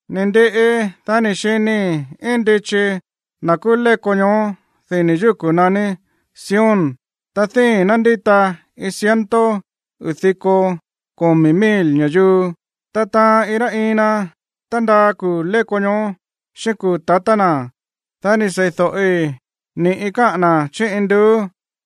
Ni̱ ndiꞌi, dá ni̱ xinii̱ íin ndichi na̱ kúú léko ñoó dini̱ yúku̱ naní Sión, ta díi̱n ná ndíta iin ciento uu̱ diko komi̱ mil ña̱yuu, ta taan iin rá iin na tándaa kuu̱ léko ñoó xíꞌín kuu̱ tatá na̱. Dá ni̱ sei̱do̱ꞌi ni̱ꞌi káꞌa̱n na̱ chí induú.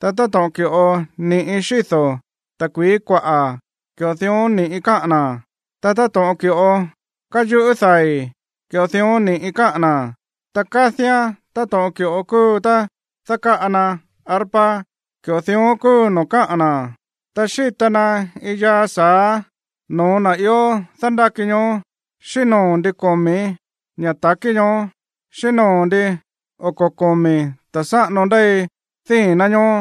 Ta táto̱ꞌon ki̱ꞌo níꞌi xído̱ ta̱kui̱í kuaꞌa̱, ki̱ꞌo dión ni̱ꞌi káꞌa̱n na̱. Ta táto̱ꞌon ki̱ꞌo káyuꞌú dai̱, ki̱ꞌo dión ni̱ꞌi káꞌa̱n na̱. Ta kádíán táto̱ꞌon ki̱ꞌo kúu tá dákáꞌa na arpa, ki̱ꞌo dión kúu noo̱ káꞌa̱n na̱. Ta xíta na iin yaa sa̱á no̱ó na̱ ió dándáki ñoó, xíꞌín noo̱ ndin komi̱ ña̱ ta̱kí ñoó, xíꞌín noo̱ ndin oko̱ komi̱ ta̱ sáꞌano ndéi díi̱n ná ñoó.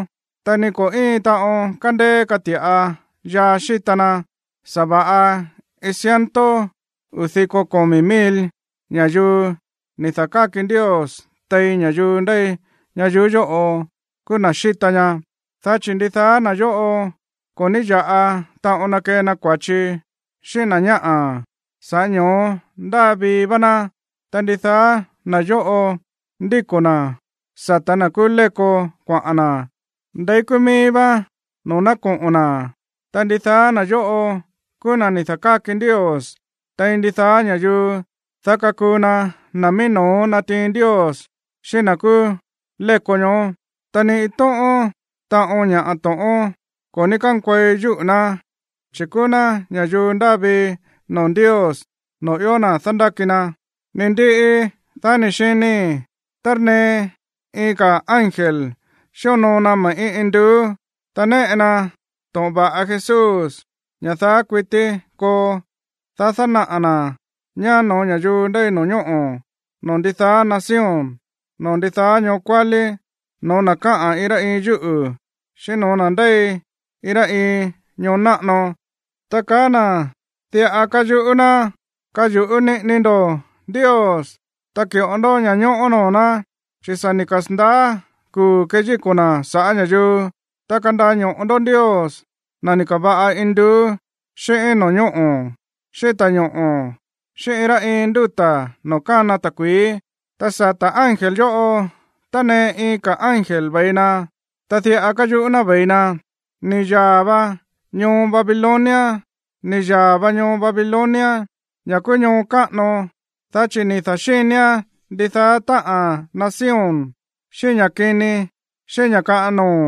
Ta ni ko̱ íin taꞌon kandeé kati̱ꞌa yaa xíta na, sa̱va̱ꞌa iin ciento uu̱ diko komi̱ mil ñayuú ni̱ da̱káki Ndios tein ña̱yuu ndéi ñayuú yóꞌo kúú na̱ xíta ña. Dá chi̱ ndidaá na̱ yóꞌo ko̱ ní ya̱ꞌa taꞌon na kee na kua̱chi xíꞌín na̱ ñáꞌa̱, sa̱ꞌá ño̱ó ndáa vii vá ná. Ta ndidaá na̱ yóꞌo ndíko̱ na̱ sa̱tá na̱ kúú léko kuaꞌa̱n na̱ ndeí kúú míí vá noo̱ ná koꞌo̱n na̱. Ta ndidaá na̱ yóꞌo kúú na̱ ni̱ da̱káki Ndios tein ndidaá ña̱yuu, dá kakuu na na̱ mií no̱ó natiin Ndios xíꞌín na̱ kúú léko ñoó. Ta ni iin tóꞌón taꞌon ña̱ to̱ꞌón ko̱ ní kánkuei yúꞌu̱ ná, chi̱ kúú ná ña̱yuu ndáa vii noo̱ Ndios, noo̱ ió na̱ dándáki na. Ni̱ ndiꞌi, dá ni̱ xinii̱ tánee iin ka̱ ángel xíonoo na me̱ꞌí induú, ta néꞌe na to̱ꞌon va̱ꞌa Jesús, ña̱ daá kuití koo, dá dánaꞌa̱ na̱ ñá no̱ó ña̱yuu ndéi no̱ñóꞌo̱, noo̱ ndidaá nación, noo̱ ndidaá ñoo kuálí, no̱ó na̱ káꞌa̱n iin rá iin yúꞌu̱, xíꞌín no̱ó na̱ ndéi iin rá iin ñoo náꞌano. Ta kaá na̱ diꞌa káyuꞌú ná: ―Kayu̱ꞌú niꞌini ndó Ndios, ta ki̱ꞌo ndó ña̱ñóꞌó noo̱ ná, chi̱ sa̱ ni̱ kasa̱ndaá kuu̱ keyíko̱ na̱ sa̱ꞌá ña̱yuu. Ta kandaño̱ꞌo ndó Ndios, na̱ ni̱ ka̱va̱ꞌa induú xíꞌín no̱ñóꞌo̱, xíꞌín ta̱ñoꞌo̱ xíꞌín iin rá iin ndúta̱ noo̱ kána ta̱kui̱í. Ta sata̱ ángel yóꞌo tánee iin ka̱ ángel ve̱i na, ta diꞌa káyuꞌú ná ve̱i na: ―Ni̱ yaa̱ va ñoo Babilonia, ni̱ yaa̱ va ñoo Babilonia, ña̱ kúú ñoo káꞌano, dá chi̱ ni̱ da̱xínián ndidaá táꞌa̱n nación xíꞌín ña̱ kini xíꞌín ña̱ kaꞌan noo̱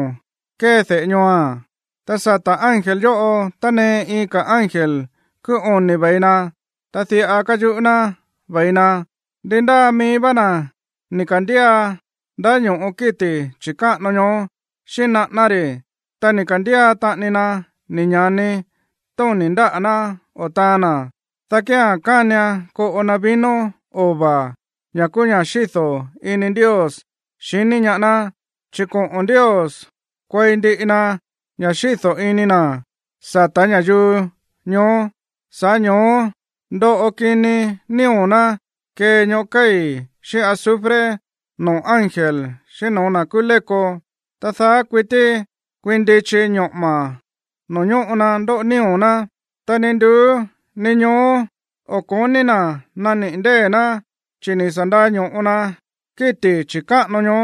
kée de̱ꞌé ñooa̱n. Ta sata̱ ángel yóꞌo tánee iin ka̱ ángel kúú oni̱ ve̱i na, ta diꞌa káyuꞌú ná ve̱i na: ―Ndi ndáa mií vá na̱ ni̱ ka̱ndía ndáño̱ꞌo kíti̱ chi̱káꞌano ñoó xíꞌín naꞌáná ri̱, ta ni̱ ka̱ndía taꞌani na ni̱ ña̱ni tóni̱ ndáꞌa̱ ná o taan na̱, dá kía̱n kánian koꞌo na vino ova̱, ña̱ kúú ña̱ xído̱ ini Ndios xiní ñaá ná, chi̱ koꞌo̱n Ndios kuei ndiꞌi na ña̱ xído̱ ini na̱ sa̱tá ña̱yuu ñoó. Sa̱ꞌá ño̱ó ndoꞌo kini nío̱ ná kee ñoꞌó kéi̱ xíꞌín azufre noo̱ ángel xíꞌín no̱ó na̱ kúú léko. Ta daá kuití kuiin ndichi ñoꞌo̱ma̱ noo̱ ñóꞌo na ndóꞌo nío̱ ná, ta ni nduú ni ñoó o̱ ko̱ní na̱ naniꞌi̱ ndée̱ ná, chi̱ ni̱ sa̱ ndaño̱ꞌo na kíti̱ chi̱káꞌano ñoó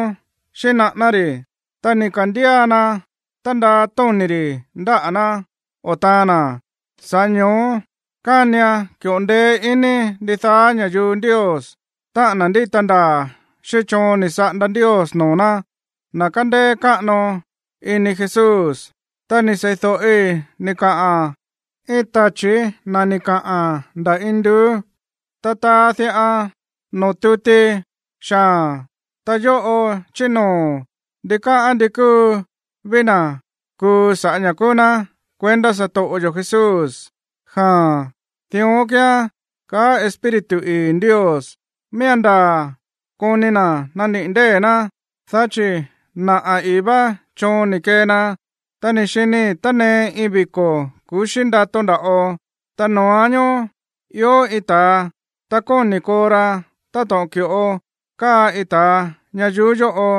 xíꞌín naꞌáná ri̱, ta ni̱ ka̱ndía na tándaa tóni̱ ri̱ ndáꞌa̱ ná o taan na̱. Sa̱ꞌá ño̱ó kánian ki̱ꞌo ndeé iní ndidaá ña̱yuu Ndios, táꞌa̱n na̱ ndíta ndaa̱ xíꞌín choon ni̱ saꞌanda Ndios noo̱ ná, na̱ kándéé káꞌano iní Jesús. Ta ni̱ sei̱do̱ꞌi ni̱ kaꞌa̱n iin tachi̱ na̱ ni̱ kaꞌa̱n nda̱ induú: ―Ta taa diꞌa noo̱ tuti xaa̱n: “Ta yóꞌo chí noo̱ ndikáꞌán ndi kúu ví na̱ kuu sa̱ꞌá ña̱ kúú ná kuendá satoꞌo yo̱ Jesús.” Jaa̱n, dión kíán, kaá Espíritu ii̱ Ndios. Miía̱n ndaa̱ koni na̱ naniꞌi̱ ndée̱ ná, dá chi̱ naꞌa̱ ii̱ vá choon ni̱ kee na. Ta ni̱ xinii̱ tánee iin viko̱ ku̱xí ndato nda̱ꞌo, ta noo̱án ñoó ió iin ta̱a, ta kóni̱ koo ra táto̱ꞌon ki̱ꞌo káa iin ta̱a ñayuú yóꞌo.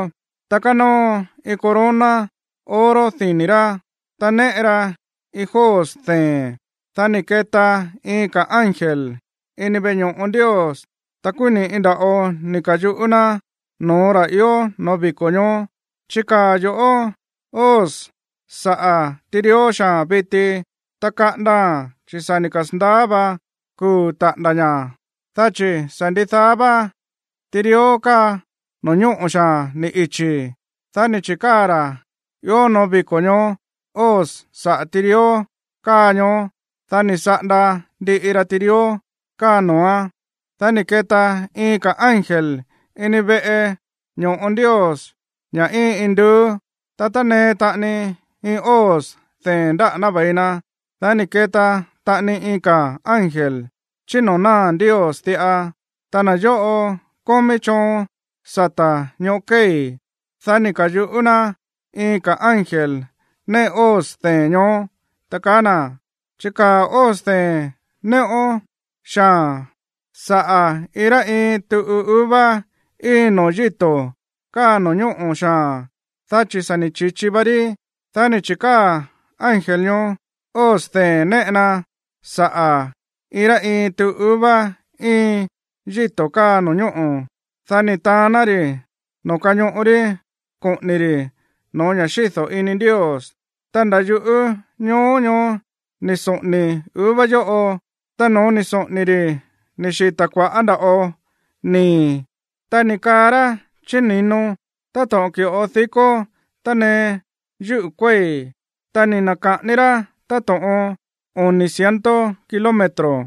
Ta kánóo iin corona oro dini̱ rá, ta néꞌe ra iin hoz dee̱n. Dá ni̱ keta iin ka̱ ángel ini veꞌe ño̱ꞌo Ndios, ta kúú ni̱ꞌi nda̱ꞌo ni̱ ka̱yuꞌú ná no̱ó ra̱ ió no̱ó viko̱ ñoó: ―Chikaa̱ yo̱ꞌó hoz saꞌa̱ tirió xaa̱n viti, ta kaꞌandaa̱n, chi̱ sa̱ ni̱ kasa̱ndaá va kuu̱ taꞌa̱nda̱ ña̱, dá chi̱ sa̱ ndidaá vá tirió káa no̱ñóꞌo̱ xaa̱n ni̱ ichi̱. Dá ni̱ chi̱káa̱ ra̱ ió noo̱ viko̱ ñoó hoz saꞌa̱ tirió káa ñoó, dá ni̱ saꞌanda ndiꞌi ra tirió káa noo̱án. Dá ni̱ keta iin ka̱ ángel ini veꞌe ño̱ꞌo Ndios, ña̱ íin induú, ta tánee taꞌani iin hoz dee̱n ndáꞌa̱ ná ve̱i na. Dá ni̱ keta taꞌani iin ka̱ ángel chí noo̱ náa̱ Ndios diꞌa, ta na̱ yóꞌo kómí choon sata̱ ñoꞌó kéi̱. Dá ni̱ ka̱yuꞌú ná iin ka̱ ángel néꞌe hoz dee̱n ñoó, ta kaá na̱: ―Chikaa̱ hoz dee̱n néꞌón xaa̱n saꞌa̱ iin rá iin tuꞌu uva íin noo̱ yíto̱ káa no̱ñóꞌo̱ xaa̱n, dá chi̱ sa̱ ni̱ chi̱chi va rí. Dá ni̱ chi̱káa̱ ángel ñoó hoz dee̱n néꞌe na saꞌa̱ iin rá iin tuꞌu uva íin yíto̱ káa no̱ñóꞌo̱. Dá ni̱ taán ná ri̱ noo̱ kañoꞌo rí koꞌo̱ni̱ ri̱ no̱ó ña̱ xído̱ ini Ndios. Ta nda̱ yuꞌú ñoo ñoó ni̱ soꞌo̱ni̱ uva yóꞌo, ta no̱ó ni̱ soꞌo̱ni̱ ri̱ ni̱ xita̱ kua̱ꞌá nda̱ꞌo nii̱, ta ni̱ kaa rá chí ni̱no táto̱ꞌon dikó tánee yúꞌu̱ kuéi̱, ta ni̱ na̱ka̱ꞌani rá táto̱ꞌon oni̱ ciento kilómetro.